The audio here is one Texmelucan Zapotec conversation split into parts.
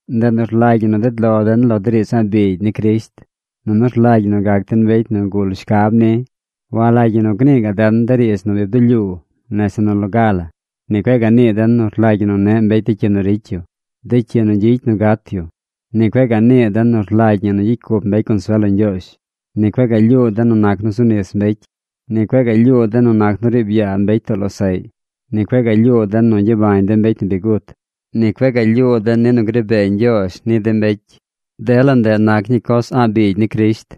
Ndeꞌ nu rlagy ñi nu ded lo den lo de riidz a̱ꞌ biigy ni Crisht, nunu rlagy ñi nu gac den mbecy nu gul shcab ni. Walagy ñi nu gnii gaꞌ den de riidz nu bi bdulyuu nese nu loga la. Ni cueꞌ gaꞌ nii den nu rlagy ñi nu neꞌ mbecy de cyi nu ricy yu, de cyi nu gyicy nu gat yu. Ni cueꞌ gaꞌ nii den nu rlagy ñi nu gyicy cup mbecy consuel lo Ñgyoozh. Ni cueꞌ gaꞌ lyuu den nu nac nu zu nis mbecy. Ni cueꞌ gaꞌ lyuu den nu nac nu riib yaa mbecy too losaꞌy. Ni cueꞌ gaꞌ lyuu den nu gyabañ de mbecy nu bi gut. Ni cueꞌ gaꞌ lyuu den ni nu gri bee Ñgyoozh ni de mbecy. Dela ndeꞌ nac ñii coz a̱ꞌ biigy ni Crisht.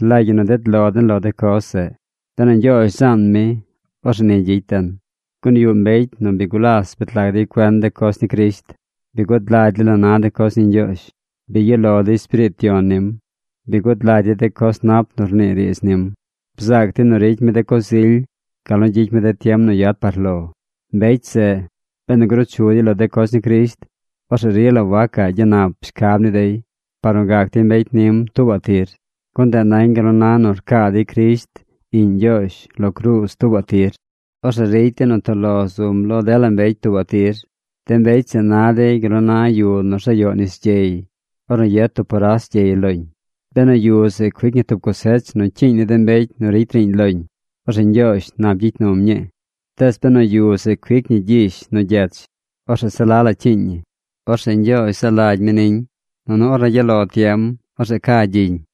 Rlagy ñi nu ded lon lo de coz zeꞌ. Benu Ñgyoozh zaan mi, orzeꞌ ni gyicy den. Gun yuꞌ mbecy nu bi gulas bet lag dey cuen de coz ni Crisht. Bi gud lagy dey la na de coz ni Ñgyoozh. Bi yuꞌ lo dey Espiriit Yon nim. Bi gud lagy dey de coz nap nu rnii riidz nim. Bzaac dey nu ricy mi de coz ily gal nu gyicy mi de tiem nu yad par lo. Mbecy zeꞌ, benu gruu chu dey lo de coz ni Crisht, orzeꞌ rila wacaꞌ gyanap shcab ni dey par nu gac dey mbecy nim tuubaꞌ tir. Gun ndeꞌ nañ gal nu na nu rcaa dey Crisht, Iꞌñ Ñgyoozh, lo cruuz tuubaꞌ tir. Orzeꞌ ricy dey nu toꞌ lo zum lo dela mbecy tuubaꞌ tir. De mbecy zeꞌ na dey gal nu na yu nu rzayoꞌ nis gyey ornu yet tub poras gyey loñ. Benu yu zeꞌ cuic ñi tub cosech nu cyiiñ ni de mbecy nu ricy riiñ loñ, orzeꞌ Ñgyoozh nap gyicy num ñii. Tees benu yu zeꞌ cuic ñi gyish nu gyech, orzeꞌ se la la cyiiñ ñi. Orzeꞌ Ñgyoozh zaa lagy mi niñ. Nunu ornu gyaꞌ lo tiem, orzeꞌ ca gyiñ.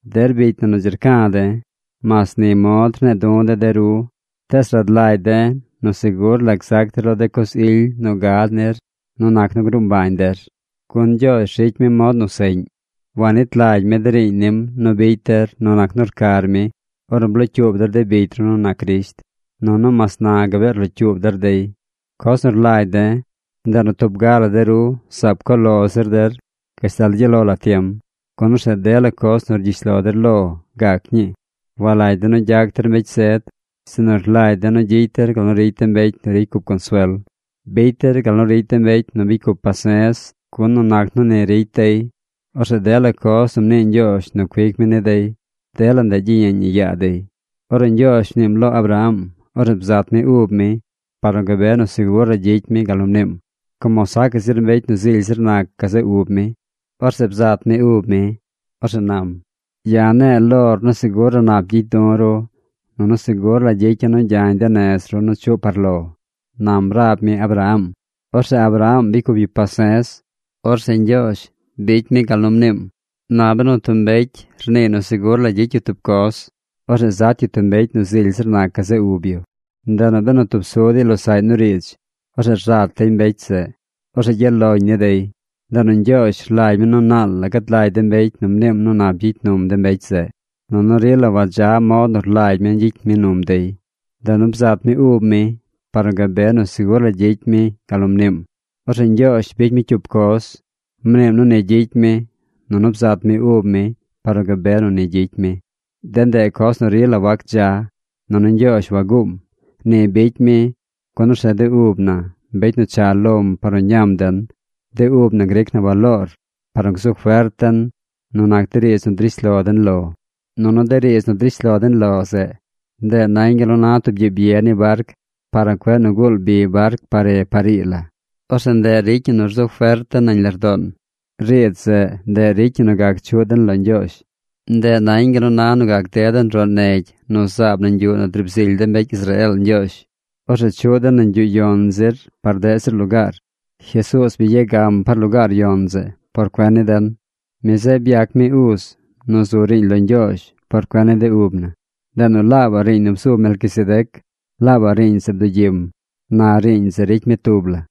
Der bicy na nu dzi rca̱ de̱, mas ni mod rne̱e̱ du̱ de̱ de ru, tees rad lagy de̱ nu segur la gzac der lo de coz ily nu gad nir nu nac nu gruu mbañ der. Gun Ñgyoozh ricy mi mod nu seꞌñ. Wanit lagy mi de riiñ nim nu bicy der nu nac nu rcar mi ornu blocyuub der de bicy ru nu nac Crisht. Nunu mas na gabee rlocyuub der dey. Coz nu rlagy de̱, ndeꞌ nu tub ga la de ru zaab co lo zir der gashtal gyaꞌ lo la tiem. Gun orzeꞌ dela coz nu rgyish lo der lo gac ñii. Walagy de̱ nu gyac der mbecy zed, sinu rlagy de̱ nu gyicy der gal nu ricy de mbecy nu ricy cup consuel. Bicy der gal nu ricy de mbecy nu bicy cup pase̱z, gun nu nac nu ni ricy dey, orzeꞌ dela coz nu mnii Ñgyoozh nu cuic mi ni dey, dela ndeꞌ gyiyeeñ ñi yaa dey. Ornu Ñgyoozh mniim lo Abraham, orzeꞌ bzat mi ub mi par nu gabe nu segur la gyicy mi gal nu mniim. Como sacaꞌ zir mbecy nu zily zir nac gazeꞌ ub mi, orzeꞌ bzat mi ub mi. Orzeꞌ nam: “Ya̱ ne̱e̱ lor nu segur la nap gyicy du̱ ru, nunu segur la gyicya̱ nu gyañ de nez ru nu chuꞌ par lo”, nam rab mi Abraham. Orzeꞌ Abraham bicy cup yu pase̱z. Orzeꞌ Ñgyoozh bicy mi gal nu mniim. Na benu tub mbecy rniiy nu segur la gyicy yu tub coz, orzeꞌ zat yu tub mbecy nu zily zir nac gazeꞌ ub yu. Ndeꞌ nu benu tub su dey losaꞌy nu riidz, orzeꞌ rzat dey mbecy zeꞌ. Orzeꞌ gyaꞌ loñ ni dey. Ndeꞌ nu Ñgyoozh rlagy mi nu naal la gad lagy de mbecy nu mniim nu nap gyicy num de mbecy zeꞌ, nunu rila wadza mod nu rlagy mi gyicy mi num dey. Ndeꞌ nu bzat mi ub mi par nu gabe nu segur la gyicy mi gal nu mniim. Orzeꞌ Ñgyoozh bicy mi cyup coz. Mniim nu ni gyicy mi. Nunu bzat mi ub mi par nu gabe nu ni gyicy mi. De ndeꞌ coz nu rila wac dza. Nunu Ñgyoozh waguum. Ni bicy mi, gun orzeꞌ de ub na, mbecy nu cha lom par nu ñam den, de ub na gric na baloor par nu gzu fert den nu nac de riidz nu drish lo den lo. Nunu de riidz nu drish lo den lo zeꞌ, ndeꞌ nañ gal nu na tub gyiib ye ni barc par nu cueꞌ guul bi barc par re par ii la. Orzeꞌ ndeꞌ ricy ñi nu rzu fert den nañ lardoon. Riidz zeꞌ, ndeꞌ ricy ñi nu gac chuꞌ den lo Ñgyoozh. Ndeꞌ nañ gal nu na nu gac ded den roꞌ negy nu zaab nañ yuꞌ nu driib zily de mbecy Israeel Ñgyoozh. Orzeꞌ chuꞌ den nañ yuꞌ yon zir par deꞌ zir lugaar. Jesuuz bi ya gam par lugaar yon zeꞌ por cuen ni den. Mi zeꞌ byac mi uz nu zu riiñ lo Ñgyoozh por cuen ni de ub na. Ndeꞌ nu laabaꞌ riiñ nu bzu Melquisedec, laabaꞌ riiñ zeꞌ bdugyim. Na riiñ zeꞌ ricy mi tub la.